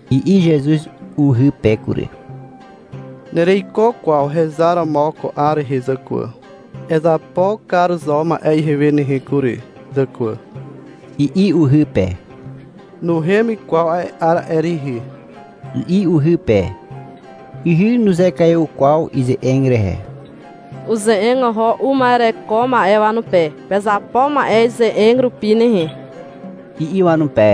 I'i Zezuz uhy pe kury. — Nereiko kwaw hezar romo ko 'ar rehe, zàkwà. Ezapo kar zo ma'e ihewe nehe kury, zàkwà, i'i uhy pe. Nuhem kwaw a'e 'ar a'e rihi, i'i uhy pe. Ihy nuzekaiw kwaw ize'eg rehe. Uze'eg oho uma'ereko ma'e wanupe. — Pezapo ma'e ize'eg rupi nehe, i'i wanupe.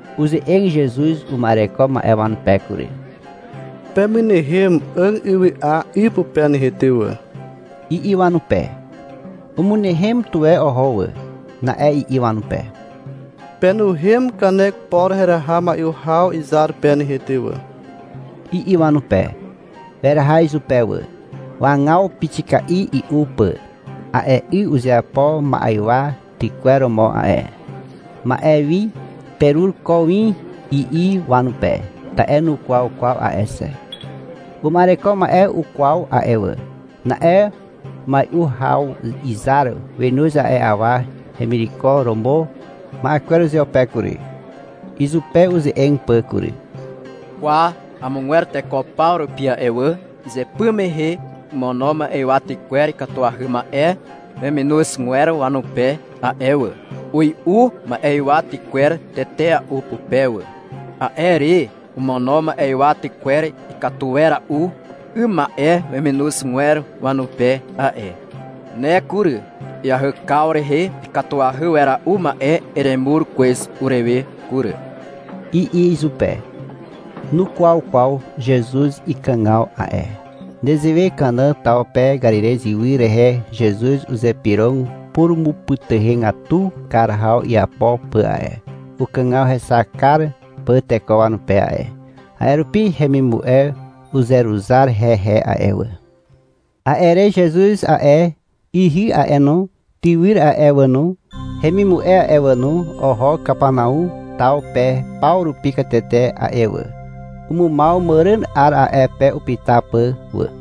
Uze'eg Zezuz uma'ereko ma'e wanupe kury. — Pemynehem 'àg ywy'a 'y pupe nehe ty wà, i'i wanupe. Umynehem tuwe oho wà. Na'e i'i wanupe. — Penuhem kanek por heraha mai'u haw izar pe nehe ty wà, i'i wanupe. Weraha izupe wà. Wagaw pixika'i i'u pà. A'e 'y uzeapo ma'ywa tykwer romo a'e. — Ma'e wi perur ko win, i'i wanupe, ta'e nukwaw kwaw a'e xe. Uma'ereko ma'e ukwaw a'e wà. Na'e mai'u haw izar wenoz a'e awa hemireko romo ma'e kwer uzeupe kury, izupe uze'eg pà kury. — Kwa, amogwer teko paw rupi a'e wà, izypy mehe omono ma'ywa tykwer ikatuahy ma'e weminozgwer wanupe a'e wà. Ui'u ma'ywa tykwer tetea'u pupe wà. A'e re omono ma'ywa tykwer ikatu wera'u 'ym ma'e weminozgwer wanupe a'e. Ne kury, iahykaw rehe ikatuahy wera'u ma'e eremur kwez urewe kury, i'i izupe. (Nukwaw kwaw Zezuz ikàgaw a'e.) Nezewe Kana taw pe Karirez ywy rehe Zezuz uzypyrog purumupytuhegatu kar haw iapo pà a'e, ukàgaw hexak kar pà teko wanupe a'e. A'e rupi hemimu'e uzeruzar hehe a'e wà. A'e re Zezuz a'e, ihy a'e no, tywyr a'e wà no, hemimu'e a'e wà no, oho Kapanau taw pe paw rupi katete a'e wà. Umumaw màràn 'ar a'e pe upyta pà wà.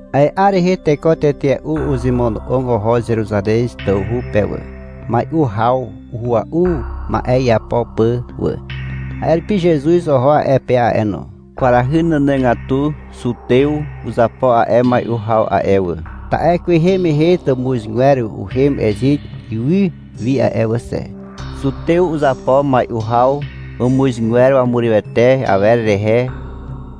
A'e 'ar rehe teko tetea'u uzemono'og oho Zeruzarez tawhu pe wà, mai'u haw uhua'u ma'e iapo pà wà. A'e rupi Zezuz oho a'e pe a'e no. Kwarahy nànàgatu Zutew uzapo a'e mai'u haw a'e wà, ta'e kwehe mehe tàmuzgwer uhem Ezit ywy wi a'e wà xe. Zutew uzapo mai'u haw wàmuzgwer wanurywete awer rehe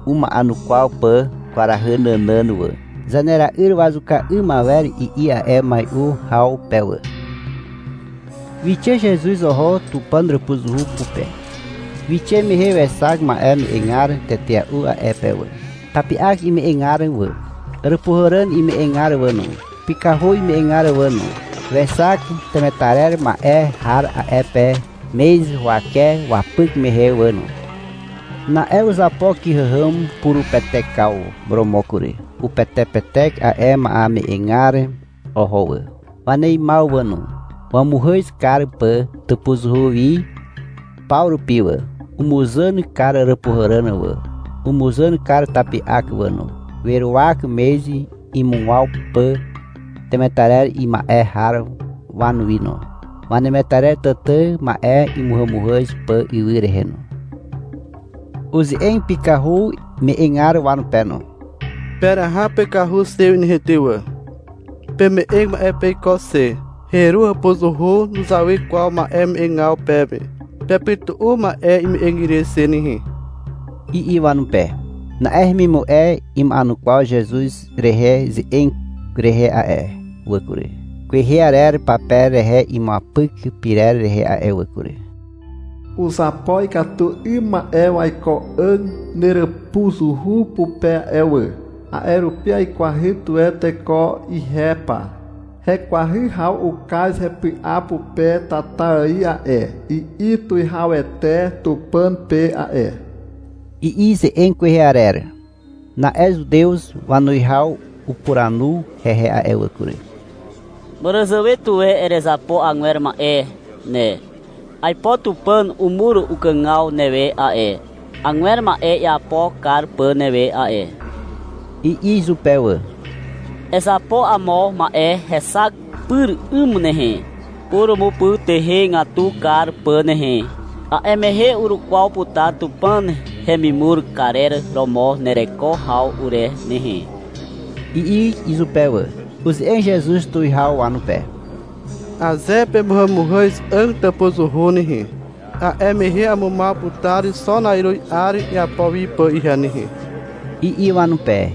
uma'enukwaw pà kwarahy nànàn wà. — Zanera'yr wazuka 'ym awer, i'i a'e mai'u haw pe wà. Wixe Zezuz oho Tupàn hàpuzuhu pupe. Wixe mehe wexak ma'e me'egar tetea'u a'e pe wà. Tapi'ak ime'egar wà, àràpuhàràn ime'egar wà no, pykahu ime'egar wà no. Wexak temetarer ma'e har a'e pe mez huwake wapyk mehe wà no. Na'e uzapo kyhàhàm purupetekaw romo kury. Upetepetek a'e ma'eme'egar oho wà, waneimaw wà no, wamuzàn kar pà tàpuzuhu wi paw rupi wà. Umuzàn kar àràpuhàràn wà, umuzàn kar tapi'ak wà no. Weruwak mez imugwaw pà temetarer ima'e har wanuwi no, wanemetarer tàtà ma'e imuhàmuhàz pà ywy rehe no. Uze'eg pykahu me'egar wanupe no. — Peraha pykahu xe wi nehe ty wà. — Peme'eg ma'e peiko xe. Heru hàpuzuhu nuzawy kwaw ma'e me'egaw peme. Pepytu'u ma'e ime'eg ire xe nehe, i'i wanupe. Na'e hemimu'e ima'enukwaw Zezuz rehe ze'eg rehe a'e wà kury, kwehe arer pape rehe imuapyk pyrer rehe a'e wà kury. — Uzapo ikatu 'ym ma'e waiko 'àg neràpuzuhu pupe a'e wà, a'e rupi aikwahy tuwe teko ihe pa. Hekwahy haw ukaz hepy'a pupe tata ài a'e, i'i tuwihawete Tupàn pe a'e, i'i ze'eg kwehe arer. Na'e zutew wanuwihaw upuranu hehe a'e wà kury. — Màràzàwe tuwe erezapo agwer ma'e ne. Aipo Tupàn umur ukàgaw newe a'e, agwer ma'e iapo kar pà newe a'e, i'i izupe wà. — Ezapo amo ma'e hexak pyr 'ym nehe, purumupytuhegatu kar pà nehe. A'e mehe urukwaw putar Tupàn hemimur karer romo nereko haw ure nehe, i'i izupe wà. Uze'eg Zezuz tuwihaw wanupe. — Aze pemuhàmuhàz 'àg tàpuzuhu nehe, a'e mehe amumaw putar xo na'iruz 'ar iapo wi pà ihe nehe, i'i wanupe.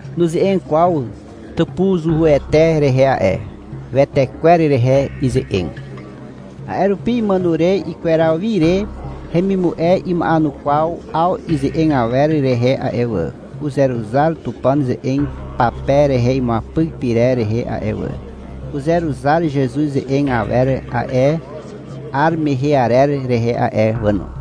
Nuze'eg kwaw tàpuzuhuete rehe a'e. Wetekwer rehe ize'eg. A'e rupi imàno re ikweraw wi re hemimu'e ima'enukwaw 'aw ize'eg awer rehe a'e wà. Uzeruzar Tupàn ze'eg pape rehe imuapyk pyrer rehe a'e wà. Uzeruzar Zezuz ze'eg awer a'e 'ar mehe arer rehe a'e wà no.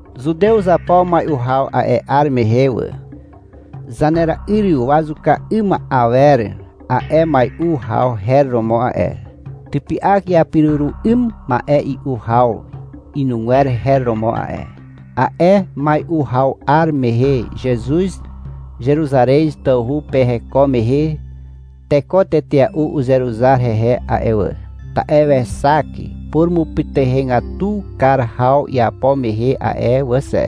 Zutew uzapo mai'u haw a'e 'ar mehe wà. — Zanera'yr wazuka 'ym awer a'e mai'u haw her romo a'e. Typy'ak iapiruru 'ym ma'e i'u haw inugwer her romo a'e. A'e mai'u haw 'ar mehe Zezuz Zeruzarez tawhu pe heko mehe, teko tetea'u uzeruzar hehe a'e wà, ta'e wexak purumupytuhegatu kar haw iapo mehe a'e wà xe.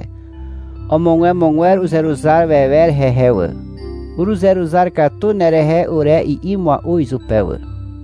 Omogwemogwer uzeruzar wewer hehe wà, — Uruzeruzar katu nerehe ure, i'i mua'u izupe wà.